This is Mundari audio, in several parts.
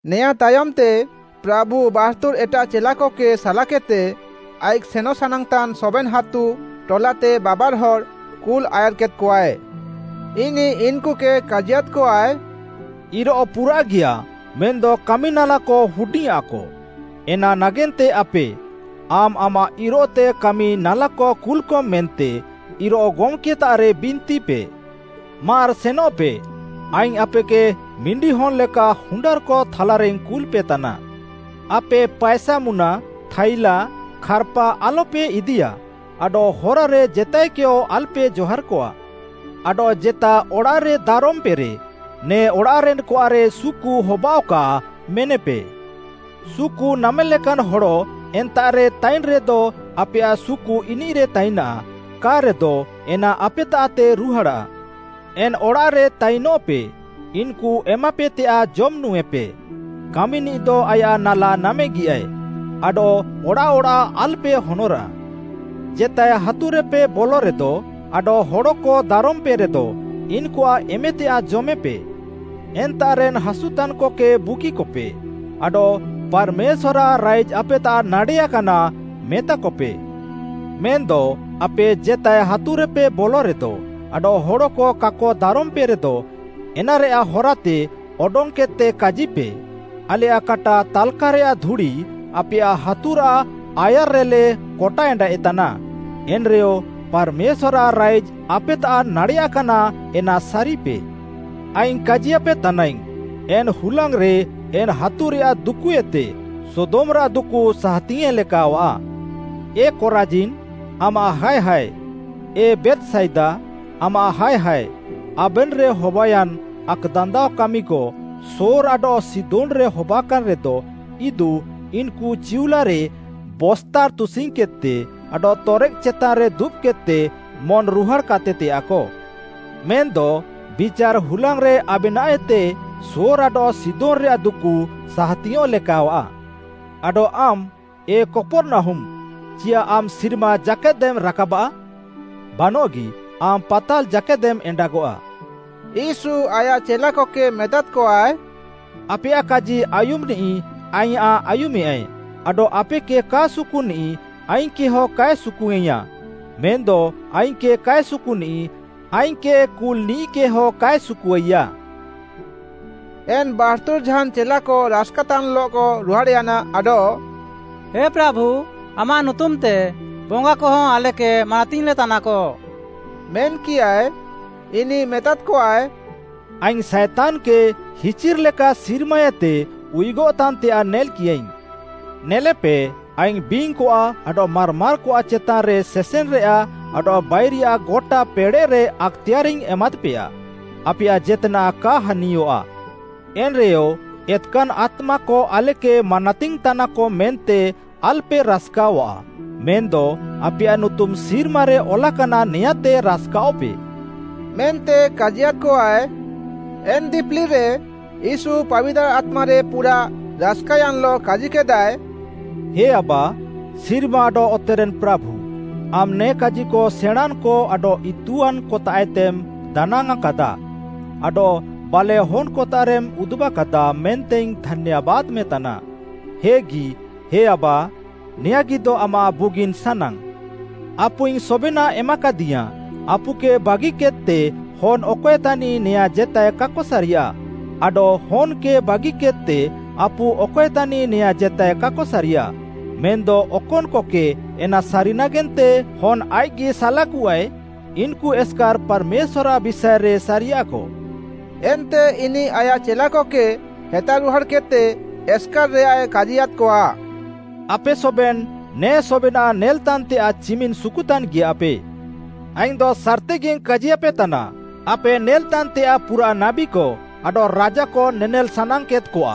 ନେଆଁଁତାୟମ୍‌ତେ ପ୍ରାଭୁ ୭୨ଏଟାଃ ଚେଲାକକେ ସାଲାକେଦ୍‌ତେ, ଆଇଃକ୍‌ ସେନଃ ସାନାଙ୍ଗ୍‌ତାନ୍ ସବେନ୍‌ ହାତୁ, ଟଲାତେ ବାବାର୍‌ହଡ଼୍‌ କୁଲ୍‌ ଆୟାର୍‌କେଦ୍‌କଆଏ। ଇନିଃ ଇନ୍‌କୁକେ କାଜିୟାଦ୍‌କଆଏ, “ଇରୋଃ ପୁରାଃଗିୟାଃ ମେନ୍‌ଦ କାମିନାଲାକ ହୁଡିଙ୍ଗ୍‌ଆଁକ, ଏନା ନାଗେନ୍ତେ ଆପେ, ଆମ୍‌ ଆମାଃ ଇରୋଃତେ କାମି ନାଲାକ କୁଲ୍‌କମ୍ ମେନ୍ତେ ଇରୋଃ ଗମ୍‌କେତାଃରେ ବିନ୍ତିପେ। ମାର୍‌ ସେନଃପେ, ଆଇଙ୍ଗ୍‌ ଆପେକେ ମିଣ୍ଡିହନ୍‌କ ଲେକା ହୁଣ୍ଡାର୍‌କ ଥାଲାରେଇଙ୍ଗ୍‌ କୁଲ୍‌ପେତାନା। ଆପେ ପାଏସାମୁନା, ଥାଇଲାଃ, ଖାର୍‌ପା ଆଲ୍‌ପେ ଇଦିୟା ଆଡଃ ହରାରେ ଜେତାଏକେୟ ଆଲ୍‌ପେ ଜହାର୍‌କଆ। ଆଡଃ ଜେତା ଅଡ଼ାଃରେ ଦାରମ୍‌ପେରେ ‘ନେ ଅଡ଼ାଃରେନ୍‌କଆଃରେ ସୁକୁ ହବାଅଃକା’ ମେନେପେ। ସୁକୁ ନାମେଲେକାନ୍ ହଡ଼ ଏନ୍ତାଃରେ ତାଇନ୍‌ରେଦ ଆପେୟାଃ ସୁକୁ ଇନିଃରେ ତାଇନାଃ, କା'ରେଦ ଏନା ଆପେତାଃତେ ରୁହାଡ଼ାଃ। ଏନ୍‌ ଅଡ଼ାଃରେ ତାଇନଃପେ, ଇନ୍‌କୁ ଏମାପେତେୟାଃ ଜମ୍ ନୁଁଏପେ, କାମିନିଃଦ ଆୟାଃ ନାଲା ନାମେଗିୟାଏ। ଆଡଃ ଅଡ଼ାଃ ଅଡ଼ାଃ ଆଲ୍‌ପେ ହନରାଃ। ଜେତାଏ ହାତୁରେପେ ବଲରେଦ ଆଡଃ ହଡ଼କ ଦାରମ୍‌ପେରେଦ, ଇନ୍‌କୁଆଃ ଏମେତେୟାଃ ଜମେପେ। ଏନ୍ତାଃରେନ୍ ହାସୁତାନ୍‌କକେ ବୁଗିକପେ, ଆଡଃ ‘ପାର୍‌ମେଶ୍ୱାର୍‌ଆଃ ରାଇଜ୍‌ ଆପେତାଃ ନାଡ଼େୟାକାନା’ ମେତାକପେ। ମେନ୍‌ଦ ଆପେ ଜେତାଏ ହାତୁରେପେ ବଲରେଦ ଆଡଃ ହଡ଼କ କାକ ଦାରମ୍‌ପେରେଦ, ଏନାରେୟାଃ ହରାଏତେ ଅଡଙ୍ଗ୍‌କେଦ୍‌ତେ କାଜିପେ, ‘ଆଲେୟାଃ କାଟା ତାଲ୍‌କାରେୟାଃ ଧୁଡ଼ି ଆପେୟାଃ ହାତୁରାଃ ଆୟାର୍‌ରେଲେ କଟା ଏଣ୍ଡାଏଃତାନା, ଏନ୍‌ରେୟ ପାର୍‌ମେଶ୍ୱାର୍‌ଆଃ ରାଇଜ୍‌ ଆପେତାଃ ନାଡ଼େୟାକାନା ଏନା ସାରିପେ।’ ଆଇଙ୍ଗ୍‌ କାଜିୟାପେ ତାନାଇଙ୍ଗ୍‌, ଏନ୍‌ ହୁଲାଙ୍ଗ୍‌ରେ ଏନ୍‌ ହାତୁରେୟାଃ ଦୁକୁଏତେ ସୋଦମ୍‌ରାଃ ଦୁକୁ ସାହାତିଙ୍ଗ୍‌ୟେଁ ଲେକାୱାଃ। “ଏ କରାଜିନ୍, ଆମାଃ ହାୟ ହାୟ, ଏ ବେଥ୍‌ସାଇଦା, ଆମାଃ ହାୟ ହାୟ, ଆବେନ୍‌ରେ ହବାୟାନ୍ ଆକ୍‌ଦାନ୍ଦାଅ କାମିକ ସୋର୍‌ ଆଡଃ ସିଦୋନ୍‌ରେ ହବାକାନ୍‌ରେଦ, ଇଦୁ ଇନ୍‌କୁ ଚିଉଲାରେ ବସ୍ତା ତୁସିଙ୍ଗ୍‌କେଦ୍‌ତେ ଆଡଃ ତରେକ୍‌ ଚେତାନ୍‌ରେ ଦୁବ୍‌କେଦ୍‌ତେ ମନ୍‌ରୁହାଡ଼୍‌ କାତେତେୟାଃକ। ମେନ୍‌ଦ ବିଚାର୍‌ ହୁଲାଙ୍ଗ୍‌ରେ ଆବେନାଃଏତେ ସୋର୍‌ ଆଡଃ ସିଦୋନ୍‌ରେୟାଃ ଦୁକୁ ସାହାତିଙ୍ଗ୍‌ୟେଁ ଲେକାୱାଃ। ଆଡଃ ଆମ୍‌, ଏ କପର୍‌ନାହୁମ୍‌, ଚିୟାଃ ଆମ୍‌ ସିର୍ମା ଜାକେଦେମ୍ ରାକାବଆଃ? ବାନଃଗି ଆମ୍‌ ପାତାଲ୍‌ ଜାକେଦେମ୍ ଏଣ୍ଡାଗଆଃ।” ୟୀଶୁ ଆୟାଃ ଚେଲାକକେ ମେତାଦ୍‌କଆଏ, “ଆପେୟାଃ କାଜି ଆୟୁମ୍‌ନିଃ ଆଇଁୟାଃ ଆୟୁମେୟାଏ, ଆଡଃ ଆପେକେ କା ସୁକୁନିଃ ଆଇଙ୍ଗ୍‌କେହଁ କାଏ ସୁକୁୱାଇଙ୍ଗ୍‌ଆଃ ମେନ୍‌ଦ ଆଇଙ୍ଗ୍‌କେ କାଏ ସୁକୁନିଃ ଆଇଙ୍ଗ୍‌କେ କୁଲ୍‌ନିଃକେ ହଁ କାଏ ସୁକୁୱାଇୟା।” ଏନ୍‌ ୭୨ଝାନ୍‌ ଚେଲାକ ରାସ୍‌କାତାନ୍‌ଲଃକ ରୁହାଡ଼୍‌ୟାନା ଆଡଃ “ହେ ପ୍ରାଭୁ, ଆମାଃ ନୁତୁମ୍‌ତେ ବଙ୍ଗାକହଁ ଆଲେକେ ମାନାତିଙ୍ଗ୍‌ଲେତାନାକ” ମେନ୍‌କିୟାଏ। ଇନିଃ ମେତାଦ୍‌କଆଏ, “ଆଇଙ୍ଗ୍‌ ସାଏତାନ୍‌କେ ହିଚିର୍‌ ଲେକା ସିର୍ମାଏତେ ଉୟୁଗଃତାନ୍‌ତେୟାଃ ନେଲ୍‌କିୟାଇଙ୍ଗ୍‌। ନେଲେପେ, ଆଇଙ୍ଗ୍‌ ବିଙ୍ଗ୍‌କଆଃ ଆଡଃ ମାର୍‌ମାର୍‌କଆଃ ଚେତାନ୍‌ରେ ସେସେନ୍‌ରେୟାଃ ଆଡଃ ବାଇରିୟାଃ ଗଟା ପେଡ଼େଃରେ ଆକ୍‌ତେୟାରାଇଙ୍ଗ୍‌ ଏମାଦ୍‌ପେୟା। ଆପେୟାଃ ଜେତ୍‌ନାଃ କା ହାନିୟଃଆ। ଏନ୍‌ରେୟ ଏତ୍‌କାନ୍‌ ଆତ୍ମାକ ଆଲେକେ ମାନାତିଙ୍ଗ୍‌ତାନାକ ମେନ୍ତେ ଆଲ୍‌ପେ ରାସ୍‌କାୱାଃ, ମେନ୍‌ଦ ଆପେୟାଃ ନୁତୁମ୍‌ ସିର୍ମାରେ ଅଲାକାନା ନେୟାଁତେ ରାସ୍‌କାଅଃପେ” ମେନ୍ତେ କାଜିୟାଦ୍‌କଆଏ। ଏନ୍‌ ଦିପିଲିରେ ୟୀଶୁ ପାବିତାର୍‌ ଆତ୍ମାରେ ପୁରାଃ ରାସ୍‌କାୟାନ୍‌ଲଃ କାଜିକେଦାଏ, “ହେ ଆବା, ସିର୍ମା ଆଡଃ ଅତେରେନ୍‌ ପ୍ରାଭୁ, ଆମ୍‌ ନେ କାଜିକ ସେଣାଁଁନ୍‌କ ଆଡଃ ଇତୁଆନ୍‌କତାଃଏତେମ୍‌ ଦାନାଙ୍ଗ୍‌ଆଁଁକାଦାଃ, ଆଡଃ ବାଲେଃ ହନ୍‌କତାଃରେମ୍ ଉଦୁବାକାଦାଃ ମେନ୍ତେଇଙ୍ଗ୍‌ ଧାନ୍ୟାବାଦ୍‌ମେତାନା। ହେଗି ହେ ଆବା, ନେୟାଁଗିଦ ଆମାଃ ବୁଗିନ୍‌ ସାନାଙ୍ଗ୍‌। “ଆପୁଇଙ୍ଗ୍‌ ସବେନାଃ ଏମାକାଦିୟାଁଏ, ଆପୁକେ ବାଗିକେଦ୍‌ତେ ହନ୍‌ ଅକଏ ତାନିଃ ନେୟାଁ ଜେତାଏ କାକ ସାରିୟାଃ, ଆଡଃ ହନ୍‌କେ ବାଗିକେଦ୍‌ତେ ଆପୁ ଅକଏ ତାନିଃ ନେୟାଁ ଜେତାଏ କାକ ସାରିୟାଃ। ମେନ୍‌ଦ ଅକନ୍‌କକେ ଏନା ସାରି ନାଗେନ୍ତେ ହନ୍‌ ଆଇଃକ୍‌ଗି ସାଲାକୁଆଏ, ଇନ୍‌କୁ ଏସ୍‌କାର୍‌ ପାର୍‌ମେଶ୍ୱାର୍‌ଆଃ ବିଷାଏରେ ସାରିୟାଃକ।” ଏନ୍ତେ ଇନିଃ ଆୟାଃ ଚେଲାକକେ ହେତାରୁହାଡ଼୍‌କେଦ୍‌ତେ ଏସ୍‌କାର୍‌ରେୟାଏ କାଜିୟାଦ୍‌କଆ, “ଆପେ ସବେନ୍‌ ନେ ସବେନାଃ ନେଲ୍‌ତାନ୍‌ତେୟାଃ ଚିମିନ୍‌ ସୁକୁତାନ୍‌ଗିୟାଃପେ। ଆଇଙ୍ଗ୍‌ଦ ସାର୍‌ତିଗିଙ୍ଗ୍‌ କାଜିୟାପେତାନା, ଆପେ ନେଲ୍‌ତାନ୍‌ତେୟାଃ ପୁରାଃ ନାବୀକ ଆଡଃ ରାଜାକ ନେନେଲ୍‌ ସାନାଙ୍ଗ୍‌କେଦ୍‌କଆ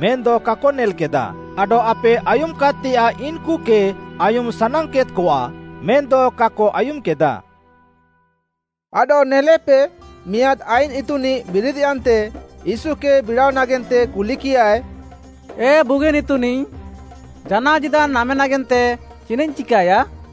ମେନ୍‌ଦ କାକ ନେଲ୍‌କେଦା ଆଡଃ ଆପେ ଆୟୁମ୍‌କେଦ୍‌ତେୟାଃ ଇନ୍‌କୁକେ ଆୟୁମ୍‌ ସାନାଙ୍ଗ୍‌କେଦ୍‌କଆ ମେନ୍‌ଦ କାକ ଆୟୁମ୍‌କେଦା।” ଆଡଃ ନେଲେପେ ମିଆଁଦ୍‌ ଆଇନ୍‌ ଇତୁନିଃ ବିରିଦ୍‌ୟାନ୍ତେ ୟୀଶୁକେ ବିଡ଼ାଅ ନାଗେନ୍ତେ କୁଲିକିୟାଏ, “ଏ ବୁଗିନ୍‌ ଇତୁନିଃ, ଜାନାଅ ଜୀଦାନ୍‌ ନାମେ ନାଗେନ୍ତେ ଚିନାଃଇଙ୍ଗ୍‌ ଚିକାୟା?”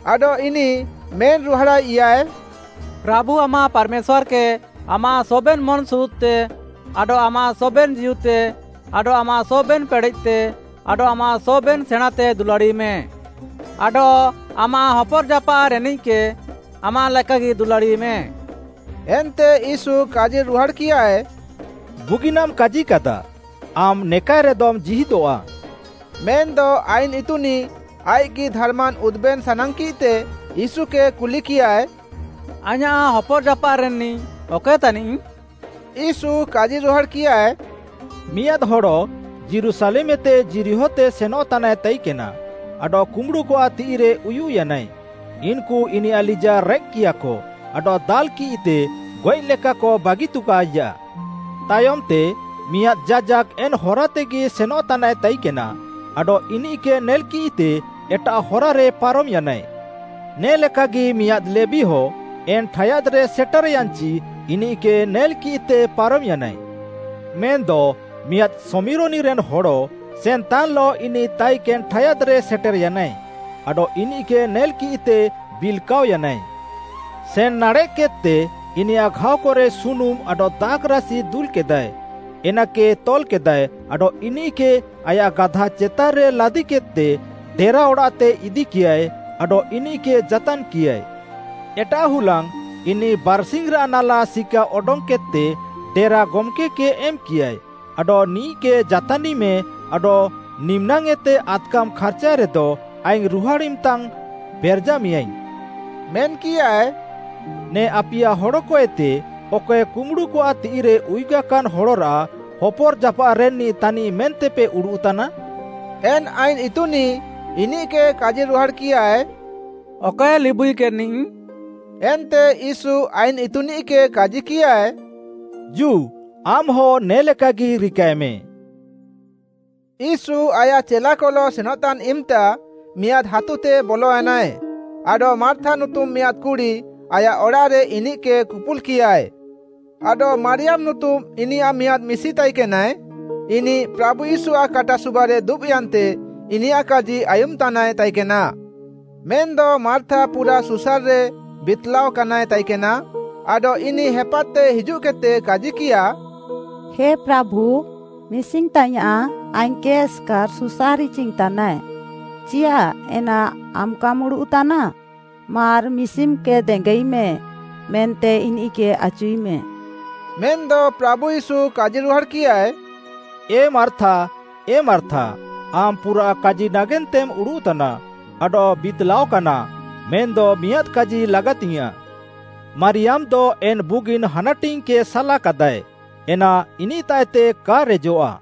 ଆଡଃ ଇନିଃ ମେନ୍‌ରୁହାଡ଼ାଇୟାଏ, “ପ୍ରାଭୁ ଆମାଃ ପାର୍‌ମେଶ୍ୱାର୍‌କେ ଆମାଃ ସବେନ୍‌ ମନ୍‌ସୁରୁଦ୍‌ତେ ଆଡଃ ଆମାଃ ସବେନ୍‌ ଜୀଉତେ ଆଡଃ ଆମାଃ ସବେନ୍‌ ପେଡ଼େଃତେ ଆଡଃ ଆମାଃ ସବେନ୍‌ ସେଣାଁଁତେ ଦୁଲାଡ଼ିମେ, ଆଡଃ ଆମାଃ ହପର୍‌ ଜାପାଃରେନ୍‌ନିଃକେ ଆମାଃ ଲେକାଗି ଦୁଲାଡ଼ିମେ।” ଏନ୍ତେ ୟୀଶୁ କାଜିରୁହାଡ଼୍‌କିୟାଏ, “ବୁଗିନାମ୍‌ କାଜିକାଦା, ଆମ୍‌ ନେକାଏରେଦମ୍ ଜୀହିଦଃଆ।” ମେନ୍‌ଦ ଆଇନ୍‌ଇତୁନିଃ ଆଇଃକ୍‌ଗି ଧାର୍‌ମାନ୍‌ ଉଦୁବେନ୍ ସାନାଙ୍ଗ୍‌କିଃତେ ୟୀଶୁକେ କୁଲିକିୟାଏ “ଆଇଁୟାଃ ହପର୍‌ଜାପାଃରେନ୍‌ନିଃ ଅକଏ ତାନିଃ?” ୟୀଶୁ କାଜିରୁହାଡ଼୍‌କିୟାଏ, “ମିଆଁଦ୍‌ ହଡ଼ ଯୀରୁଶାଲେମ୍‌ଏତେ ଯିରିହୋତେ ସେନଃତାନାଏ ତାଇକେନା ଆଡଃ କୁମ୍ବୁଡ଼ୁକଆଃ ତିଃଇରେ ଉୟୁଃୟାନାଏ, ଇନ୍‌କୁ ଇନିୟାଃ ଲିଜାଃ ରେକ୍‌କିୟାଃକ ଆଡଃ ଦାଲ୍‌କିଃତେ ଗଏଃଲେକାକ ବାଗିତୁକାଇଜାଃ। ତାୟମ୍‌ତେ ମିଆଁଦ୍‌ ଯାଜାକ୍‌ ଏନ୍‌ ହରାତେଗି ସେନ୍‌ତାନାଏ ତାଇକେନା ଆଡଃ ଇନିଃକେ ନେଲ୍‌କିଃତେ ଏଟାଃ ହରାରେ ପାରମ୍‌ୟାନାଏ। ନେ ଲେକାଗି ମିଆଁଦ୍‌ ଲେବୀହ, ଏନ୍‌ ଠାୟାଦ୍‌ରେ ସେଟେର୍‌ୟାନ୍‌ଚି ଇନିଃକେ ନେଲ୍‌କିଃତେ ପାରମ୍‌ୟାନାଏ। ମେନ୍‌ଦ ମିଆଁଦ୍‌ ଶମିରୋନିରେନ୍ ହଡ଼ ସେନ୍‌ତାନ୍‌ଲଃ ଇନିଃ ତାଇକେନ୍‌ ଠାୟାଦ୍‌ରେ ସେଟେର୍‌ୟାନାଏ ଆଡଃ ଇନିଃକେ ନେଲ୍‌କିଃତେ ବିଲ୍‌କାଅୟାନାଏ। ସେନ୍ ନାଡ଼େଃକେଦ୍‌ତେ ଇନିୟାଃ ଘାଅକରେ ସୁନୁମ୍‌ ଆଡଃ ଦାଖ୍‌ରାସି ଦୁଲ୍‌କେଦାଏ, ଏନାକେ ତଲ୍‌କେଦାଏ ଆଡଃ ଇନିଃକେ ଆୟାଃ ଗାଧାଚେତାନ୍‌ରେ ଲାଦିକିଃତେ ଡେରା ଅଡ଼ାଃତେ ଇଦିକିୟାଏ ଆଡଃ ଇନିଃକେ ଯାତାନ୍‌କିୟାଏ। ଏଟାଃ ହୁଲାଙ୍ଗ୍‌ ଇନିଃ ବାର୍‌ସିଙ୍ଗ୍‌ରାଃ ନାଲା ସିକା ଅଡଙ୍ଗ୍‌କେଦ୍‌ତେ ଡେରା ଗମ୍‌କେ କେ ଏମ୍‌କିୟାଏ ଆଡଃ ନିଃକେ ଯାତାନିଃମେଁ ଆଡଃ ନିମ୍‌ନାଙ୍ଗ୍‌ଏତେ ଆଦ୍‌କାମ୍ ଖାର୍ଚାଏରେଦ ଆଇଙ୍ଗ୍‌ ରୁହାଡ଼୍‌ ଇମ୍‌ତା ପେରେଜାମେଁୟାଇଙ୍ଗ୍‌” ମେନ୍‌କିୟାଏ। “ନେ ଆପିୟା ହଡ଼କଏତେ ଅକଏ କୁମ୍ବୁଡ଼ୁକଆଃ ତିଃଇରେ ଉୟୁଗାକାନ୍‌ ହଡ଼ରାଃ ହପର୍‌ଜାପାଃରେନ୍‌ନିଃ ତାନିଃ ମେନ୍ତେପେ ଉଡ଼ୁଃତାନା?” ଏନ୍‌ ଆଇନ୍‌ ଇତୁନିଃ ଇନିଃକେ କାଜିରୁହାଡ଼୍‌କିୟାଏ “ଅକଏ ଲିବୁଇକେନ୍‌ନିଃ।” ଏନ୍ତେ ୟୀଶୁ ଆଇନ୍‌ ଇତୁନିଃକେ କାଜିକିୟାଏ, “ଜୁ ଆମ୍‌ହ ନେ ଲେକାଗି ରିକାଏମେଁ।” ୟୀଶୁ ଆୟାଃ ଚେଲାକଲଃ ସେନଃତାନ୍‌ ଇମ୍‌ତା ମିଆଁଦ୍‌ ହାତୁତେ ବଲୟାନାଏ, ଆଡଃ ମାର୍ଥା ନୁତୁମ୍‌ ମିଆଁଦ୍‌ କୁଡ଼ି ଆୟାଃ ଅଡ଼ାଃରେ ଇନିଃକେ କୁପୁଲ୍‌କିୟାଏ। ଆଡଃ ମାରିୟାମ୍‌ ନୁତୁମ୍‌ ଇନିୟାଃ ମିଆଁଦ୍‌ ମିଶି ତାଇକେନାଏ, ଇନିଃ ପ୍ରାଭୁ ୟୀଶୁଆଃ କାଟା ସୁବାରେ ଦୁବ୍‌ୟାନ୍ତେ ଇନିୟାଃ କାଜି ଆୟୁମ୍‌ତାନାଏ ତାଇକେନା। ମେନ୍‌ଦ ମାର୍ଥା ପୁରାଃ ସୁସାର୍‌ରେ ବିତ୍‌ଲାଅକାନାଏ ତାଇକେନା ଆଡଃ ଇନିଃ ହେପାଦ୍‌ତେ ହିଜୁଃକେଦ୍‌ତେ କାଜିକିୟା, “ହେ ପ୍ରାଭୁ, ମିଶିଙ୍ଗ୍‌ତାଇୟାଁଃ ଆଇଙ୍ଗ୍‌କେ ଏସ୍‌କାର୍‌ ସୁସାର୍ ଇଚିଙ୍ଗ୍‌ତାନାଏ, ଚିୟାଃ ଏନା ଆମ୍‌କାମ୍ ଉଡ଼ୁଃତାନା? ମାର୍‌ ମିଶିମ୍‌କେ ଦେଙ୍ଗାଇମେଁ” ମେନ୍ତେ ଇନିଃକେ ଆଚୁଇମେଁ। ମେନ୍‌ଦ ପ୍ରାଭୁ ୟୀଶୁ କାଜିରୁହାଡ଼୍‌କିୟାଏ, ଏ ମାର୍ଥା, ଏ ମାର୍ଥା, ଆମ୍‌ ପୁରାଃ କାଜି ନାଗେନ୍ତେମ୍ ଉଡ଼ୁଃତାନା ଆଡଃ ବିତ୍‌ଲାଅକାନା ମେନ୍‌ଦ ମିଆଁଦ୍‌ କାଜି ଲାଗାତିଙ୍ଗ୍‌ୟାଁଃ। ମାରିୟାମ୍‌ଦ ଏନ୍‌ ବୁଗିନ୍‌ ହାନାଟିଙ୍ଗ୍‌କେ ସାଲାକାଦାଏ, ଏନା ଇନିଃତାଃଏତେ କା ରେଜଃଆ।